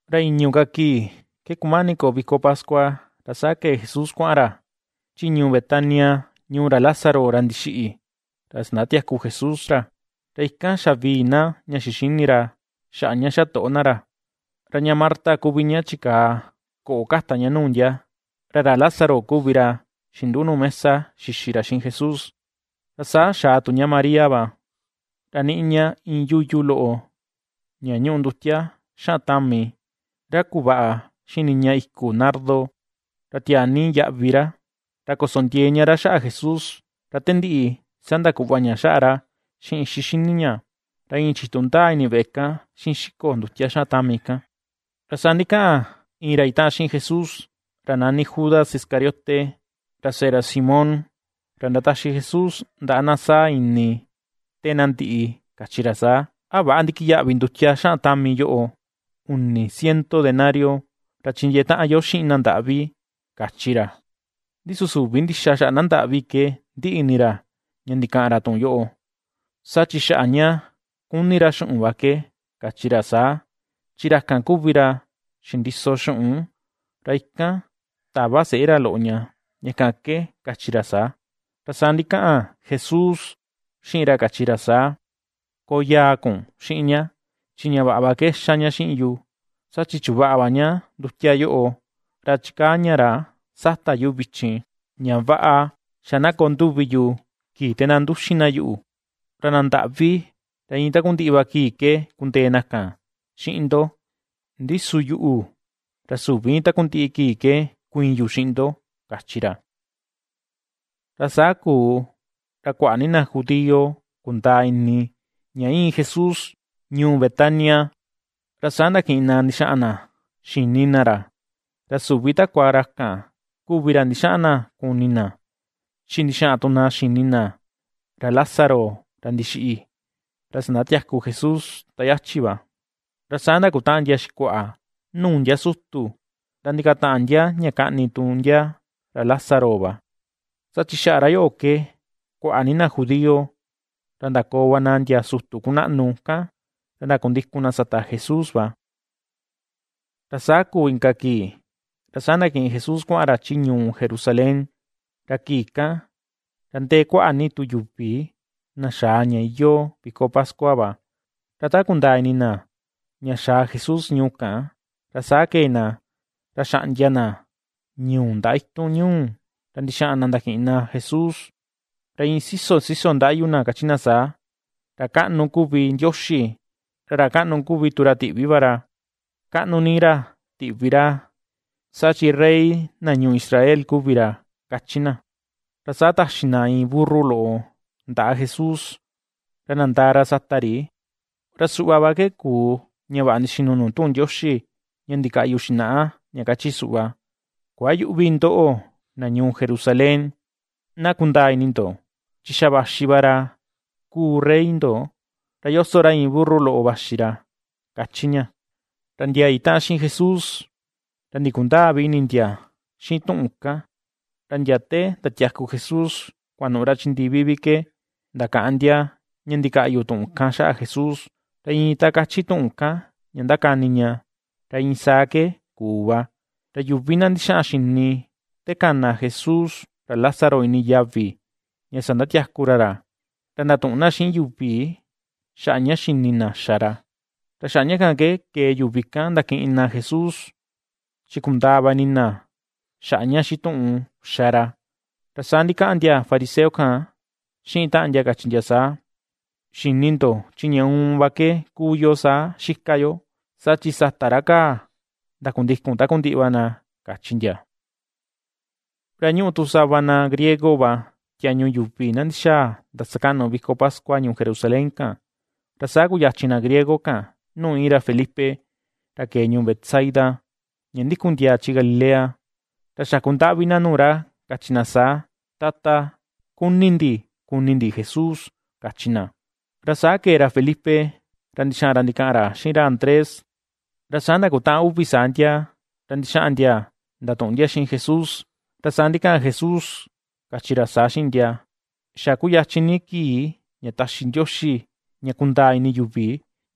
Ra i̱ñu̱ ka kii ke kumani koo viko pascua, ra saa kee Jesús kuaꞌan ra chi ñuu Betania ñuu ra Lázaro ra ndixiꞌi, ra ndasatiaku Jesús ra. Ra ikan xavii na ña xixini ra xaꞌa ña xatoꞌo na ra, ra ña Marta kuvi ña chikaa koꞌo kata ña nuu ndia, ra ra Lázaro kuvi ra xinduꞌu nuu mesa xixi ra xiꞌin Jesús. Ra saa xaa tu ña María va, ra niꞌi ña iin yuyu loꞌo ña ñuꞌu ndutia xaꞌan tami, ra kuvaꞌa xiꞌin niña iku nardo, ra tiaa ni yaꞌvi ra, ra koso ndiee ña ra xaꞌa Jesús, ra te ndiꞌi saa ndakuꞌva ña xaꞌa ra xiꞌin ixi xini ña, ra iin chitu ndaa ini veꞌe kan, xiꞌin xiko ndutia xaꞌan tami kan. Ra saa ndikaꞌan iin ra itaꞌan xiꞌin Jesús, ra nani Judas Iscariote ra seꞌe Simón, ra ndataxi Jesús ndaꞌa na sáa̱ ini te na ndiꞌi, kachi ra saa: ―¿A väꞌa ndikiyaꞌvi ndutia xaꞌan tami yoꞌo, uni ciento denario, ra chindiee taꞌan yo xiꞌin na ndaꞌvi? ―kachi ra. Ndi su süvi ndixa xaꞌa na ndaꞌvi ke ndiꞌi ini ra ña ndikaꞌan ra tuꞌun yoꞌo; saa chi xaꞌa ña kuni ra xuꞌun va ke kachi ra saa; chi ra kan kuvi ra xindiso xuꞌun, ra ikan tava seꞌe ra loꞌo ña, ña kan ke kachi ra saa. Ra saa ndikaꞌan Jesús xiꞌin ra kachi ra saa: ―Koo yaa kun xiꞌin ña, chi ña vaꞌa va ke ^xa ña xiꞌin yu, saa chi chuvaꞌa va ña ndutia yoꞌo, ra chikaa ña ra sata yu vichin, ña vaꞌa xa na koo nduvi yu kii te na nduxin na yuꞌu. Ra na ndaꞌvi, ra iin takundiꞌi va kii ke kundee na kan xiꞌin ndo; ndi su yuꞌu, ra süvi iin takundiꞌi kii ke kuiin yu xiꞌin ndo ―kachi ra. Ra saa kuu, ra kuaꞌa ni na judío kundaa ini ña íin Jesús ñuu Betania, ra saa ndakiꞌin na ndixaꞌan na xini na ra, ra süvi takua ra kan kuvi ra ndixaꞌan na kuni na, chi ndixaꞌan tu na xini na ra Lázaro ra ndixiꞌi, ra ndasatiaku Jesús ta yachi va. Ra saa ndakutaꞌan ndia xikuaꞌa nuu ndia sutu, ra ndikataꞌan ndia ña kaꞌni tu ndia ra Lázaro va, saa chi xaꞌa ra yoꞌo ke, kuaꞌa ni na judío ra ndakoo va na ndia sutu kunaꞌnu kan, ra ndakundikun na sata Jesús va. Ra saa kuu inka kii, ra saa ndakiꞌin Jesús kuaꞌan ra chi ñuu Jerusalén, ra kii kan ra ndee kuaꞌa tu yuvi na xaa ña iyoo viko pascua va, ra ta kundaa ini na ña xaa Jesús ñuu kan, ra saa kee na, ra xaꞌndia na ñuu ndaꞌa itun ñuu, ra ndixaꞌan na ndakiꞌin na Jesús, ra iin siso, siso ndaꞌyu na kachi na saa: ―¡Ra kaꞌnu kuvi Ndioxi! ¡Ra ra kaꞌnu kuu tu ra tiꞌvi va ra! ¡Kaꞌnu ni ra tiꞌvi ra, saa chin Rey na ñuu Israel kuvi ra! ―kachi na. Ra saa taxi na iin burru loꞌo ndaꞌa Jesús ra nandaa ra sata ri. Ra suꞌva va ke kuu ña vaꞌa ndixinu nuu tuꞌun Ndioxi, ña ndikaꞌyu xinaꞌa, ña kachi suꞌva: Kuayüꞌvi ndoꞌo, na ñuu Jerusalén; na kundaa ini ndo, chi xa vaxi va ra kuu rey ndo, ra yoso ra iin burru loꞌo vaxi ra, ^kachi ña. Ra ndia itaꞌan xiꞌin Jesús, ra ndikundäa vi ini ndia xiꞌin tuꞌun kan, ra ndia te ndatiaku Jesús kuanuꞌu ra chi ndivi vi ke, ndakaꞌan ndia ña ndikaꞌyu tuꞌun kan xaꞌa Jesús, ra iin ta kachi tuꞌun kan ña ndakani ña, ra iin saa ke kuu va. Ra yuvi na ndixaꞌan xini te kana Jesús ra Lázaro ini yavi ña sandatiaku ra ra, ra ndatuꞌun na xiꞌin yuvi xaꞌa ña xini na xa ra. Ra xaꞌa ña kan ke kee yuvi kan ndakiꞌin na Jesús, chi kundaa va ini na xaꞌa ña xituꞌun xa ra. Ra saa ndikaꞌan ndia fariseo kan xiꞌin taꞌan ndia kachi ndia saa: ―Xi̱nì ndo chin ña uun va ke kuu yo saa xika yo, saa chi sata ra kaa, ndakundikun takundiꞌi va na ―kachi ndia. Ra ñúꞌu tu sava na griego va tiañu yuvi na ndixaa ndasakaꞌnu viko pascua ñuu Jerusalén kan. Ra saa kuyachin na griego kan nuu iin ra Felipe ra kee ñuu Betsaida, ña ndikun ndiaa chi Galilea, ra xakundaꞌvi na nuu ra kachi na saa: ―Tata, kuni ndi kuni ndi Jesús ―kachi na. Ra saa kee ra Felipe ra ndixaꞌan ra ndikaꞌan ra xiꞌin ra Andrés, ra saa ndakutaꞌan uvi saa ndia ra ndixaꞌan ndia ndatuꞌun ndia xiꞌin Jesús. Ra saa ndikaꞌan Jesús kachi ra saa xiꞌin ndia: ―Xa kuyachin ni kii ña taxi Ndioxi ña kundaa ini yuvi,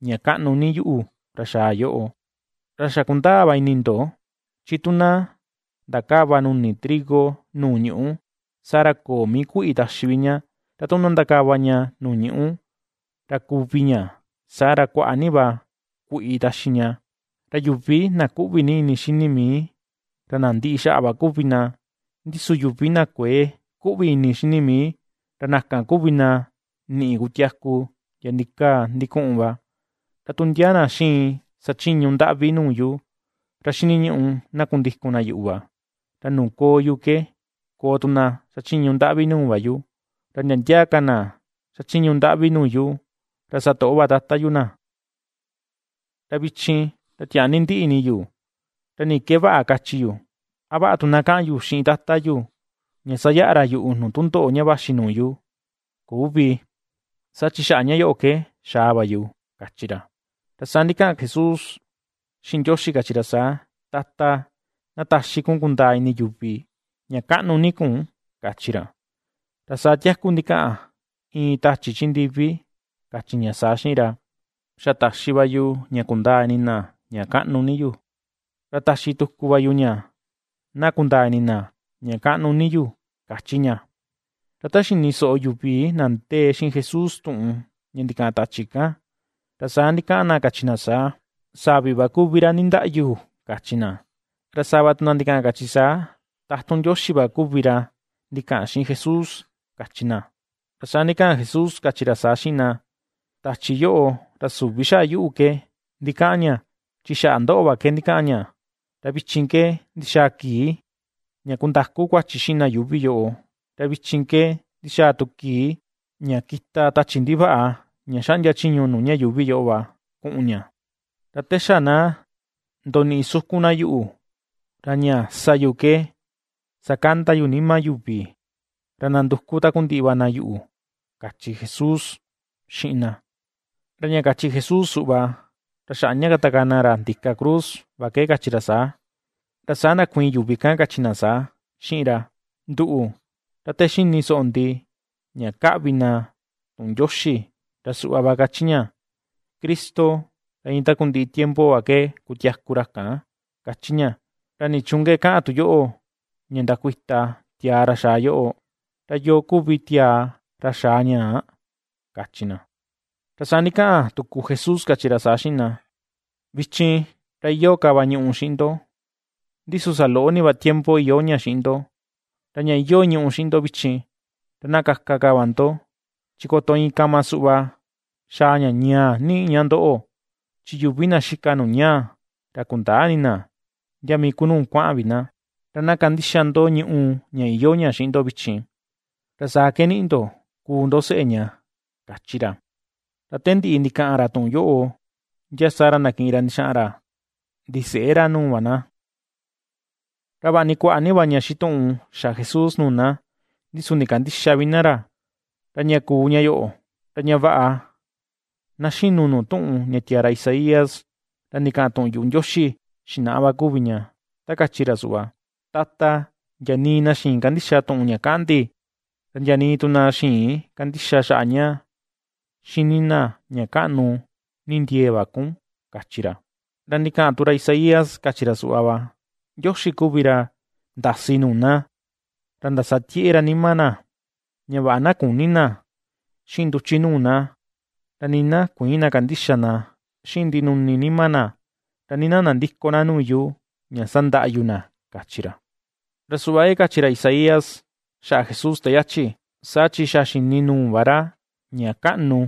ña kaꞌnu ni yuꞌu, ra xaa yoꞌo. Ra xa kundaa va ini ndo, chi tu na ndakäva nuni trigo nuu ñuꞌu, saa ra köo mii kuiꞌi taxi vi ña, ra tu na ndakava ña nuu ñuꞌu, ra kuvi ña, saa ra, kuaꞌa ni va kuiꞌi taxi ña. Ra yuvi na kuꞌvi ni ini xini mii, ra na ndiꞌi xaꞌa va kuvi na; ndi su yuvi na kuë kuꞌvi ini xini mii, ra na kan kuvi na niꞌi kutiaku ndia ndikaa ndikuꞌun va. Ra tu ndia na xiin sachiñu ndaꞌvi nuu yu, ra xiniñuꞌu na kundikun na yuꞌu va, ra nuu koo yu ke koo tu na xachiñu ndaꞌvi nuu va yu, ra ndia ndia ka na ^xachiñu ndaꞌvi nuu yu, ra satoꞌo va Tata yu na. ’Ra vichin ra tiaa ni ndiꞌi ini yu. ¿Ra ni ke vaꞌa kachi yu? ¿A vaꞌa tu na kaꞌan yu xiꞌin Tata yu ña sayaꞌa ra yuꞌu nuu tundoꞌo ña vaxi nuu yu? Küvi, saa chi xaꞌa ña yoꞌo ke xaa va yu ―kachi ra. Ra saa ndikaꞌan ka Jesús xiꞌin Ndioxi kachi ra saa: ―Tata, na taxi kun kundaa ini yuvi, ña kaꞌnu ni kun ―kachi ra. Ra saa tiaku ndikaꞌan iin tachi chi ndivi kachi ña saa xiꞌin ra: ―Xa taxi va yu ña kundaa ini na, ña kaꞌnu ni yu, ra taxi tuku va yu ña na kundaa ini na, ña kaꞌnu ni yu ―kachi ña. Ra ta xini soꞌo yuvi na ndee xiꞌin Jesús tuꞌun ña ndikaꞌan tachi kan, ra saa ndikaꞌan na kachi na saa: ―Savi va kuvi ra nindaꞌyu ―kachi na. Ra sava tu na ndikaꞌan kachi saa: ―Tatun Ndioxi va kuvi ra ndikaꞌan xiꞌin Jesús ―kachi na. Ra saa ndikaꞌan Jesús kachi ra saa xiꞌin na: ―Tachi yoꞌo, ra süvi xaꞌa yuꞌu ke ndikaꞌan ña, chi xaꞌa ndoꞌo va ke ndikaꞌan ña. Ra vichin ke ndixaa kii ña kundaku kuachi xiꞌin na yuuvi yoꞌo; ra vichin ke ndixaa tu kii ña kita tachi ndivaꞌa ña xaꞌndia chiñu nuu ña yuuvi yoꞌo va, kuꞌun ña. Ra te xa na ndoniꞌi sukun na yuꞌu, ra ña sa yu ke sakanda yu nima yuvi ra nanduku takundiꞌi va na yuꞌu ―kachi Jesús xiꞌin na. Ra ña kachi Jesús suꞌva, ra xaꞌa ña katakaa na ra ndika cruz, va ke kachi ra saa. Ra saa ndakuiin yuvi kan kachi na saa xiꞌin ra: ―Nduꞌu, ra te ^xini soꞌo ndi ña kaꞌvi na tuꞌun Ndioxi ra suꞌva va kachi ña, Cristo ra iin takundiꞌi tiempo va ke kutiaku ra kan, kachi ña. ¿Ra nichuun ke kaꞌan tu yoꞌo ña ndakuita tiaa ra xaa yoꞌo? ¿Ra yoo kuvi tiaa ra xaa ñaa? ―kachi na. Ra saa ndikaꞌan tuku Jesús, kachi ra saa xiꞌin na: ―Vichin, ra iyoo ka va ñùꞌù xiꞌin ndo, ndi su saloꞌo ni va tiempo iyoo ña xiꞌin ndo. Ra ña iyoo ñùꞌù xiꞌin ndo vichin, ra na kaka va ndo, chi koto iin kama suꞌva xaa ña ñaa niꞌi ña ndoꞌo, chi yuvi na xika nuu ñaa, ra kundäa ini na ndia mii ku nuu kuaꞌan vi na. Ra na kandixa ndo ñùꞌù ña iyoo ña xiꞌin ndo vichin, ra saa ke niꞌi ndo, kuu ndo seꞌe ña ―kachi ra. Ra te ndiꞌi ndikaꞌan ra tuꞌun yoꞌo, ndia saa ra ndakiꞌin ra ndixaꞌan ra ndiseꞌe ra nuu va na. Ra vaꞌa ni kuaꞌa ni va ña xituꞌun xa Jesús nuu na, ndi su ndikandïxa vi na ra. Ra ña kuu ña yoꞌo, ra ña vaꞌa na xinu nuu tuꞌun ña tiaa ra Isaías, ra ndikaꞌan tuꞌun yuꞌu Ndioxi xinaꞌa va kuvi ña, ta kachi ra suꞌva: Tata, ndia nii na xïin kandixa tuꞌun ña kaꞌan ndi Ra ndia nii tu na xïin kandixa xaꞌa ña ^xini na ña kaꞌnu ni ndiee va kun, kachi ra. Ra ndikaꞌan tu ra Isaías kachi ra suꞌva va: Ndioxi kuvi ra ndasi nuu na, ra ndasatieꞌe ra nima na, ña vaꞌa na küni na xiꞌin nduchi nuu na, ra nii na kuïin na kandixa na xiꞌin ndinuni nima na, ra nii na nandïko na nuu yu, ña sandaꞌa yu na, kachi ra. Ra suꞌva ke kachi ra Isaías xaꞌa Jesús te yachi, saa chi xa xini nuu va ra ña kaꞌnu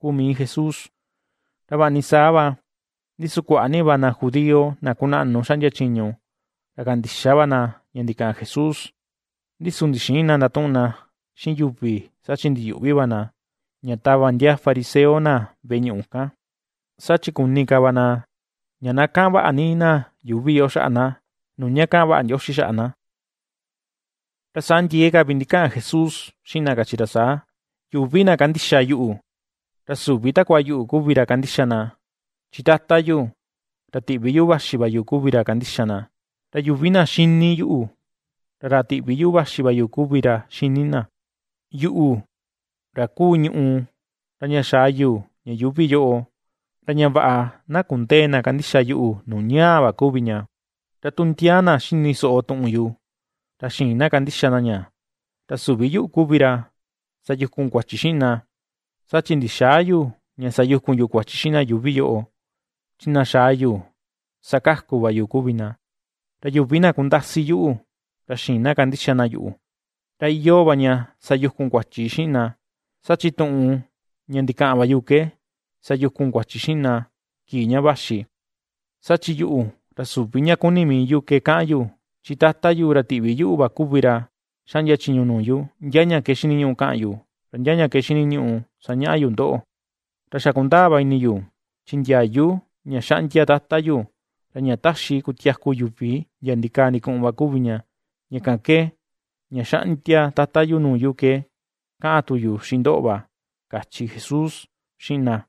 kuu mii Jesús. Ra vaꞌa ni saa va, ndi su kuaꞌa ni va na judío na kunaꞌnu xaꞌndia chiñu ra kandixa va na ña ndikaꞌan Jesús, ndi su ndixïin na ndatuꞌun na xiꞌin yuvi saa chi ndiyuꞌvi va na, ña tava ndia fariseo na veꞌe ñuꞌu kan. Saa chi kuni ka va na, ña na kaꞌan vaꞌa ni na yuuvi yoꞌo xaꞌa na, nuu ña kaꞌan vaꞌa Ndioxi xaꞌa na. Ra saa ndiee ka vi ndikaꞌan Jesús xiꞌin na kachi ra saa: ―Yuvi na kandixa yuꞌu, ra süvi takua yuꞌu kuvi ra kandixa na, chi Tata yu, ra tiꞌvi yuꞌu vaxi va yu kuvi ra kandixa na. Ra yuvi na ^xíní yuꞌu, ra ra tiꞌvi yuꞌu vaxi va yu kuvi ra ^xíní na. Yuꞌu, ra kuu ñùꞌù, ra ña xaa yu ña yuuvi yoꞌo, ra ña vaꞌa na kundëe na kandixa yuꞌu, nuu ñaa va kuvi ña. Ra tu ndia na ^xini soꞌo tuꞌun yu, ra xïin na kandixa na ña, ra süvi yuꞌu kuvi ra sayukun kuachi xiꞌin na, saa chi ndixäa yu, ña sayukun yu kuachi xiꞌin na yuuvi yoꞌo, chi na xaa yu sakaku va yu kuvi na. Ra yuvi na kundasi yuꞌu, ra xïin na kandixa na yuꞌu, ra iyoo va ña sayukun kuachi xiꞌin na, saa chi tuꞌun ña ndikaꞌan va yu ke sayukun kuachi xiꞌin na kii ña vaxi. Saa chi yuꞌu, ra süvi ña kuni mii yu ke kaꞌan yu; chi Tata yu ra tiꞌvi yuꞌu va kuvi ra xaꞌndia chiñu nuu yu, ndia ña ke xiniñuꞌu kaꞌan yu, ra ndia ña ke xiniñuꞌu sañaꞌa yu ndoꞌo. Ra xa kundaa va ini yu, chi ndiayu ña xaꞌndia Tata yu, ra ña taxi kutiaku yuvi ndiaa ndikaa ndikuꞌun va kuvi ña. Ña kan ke, ña xaꞌndia Tata yu nuu yu ke kaꞌan tu yu xiꞌin ndoꞌo va ―kachi Jesús xiꞌin na.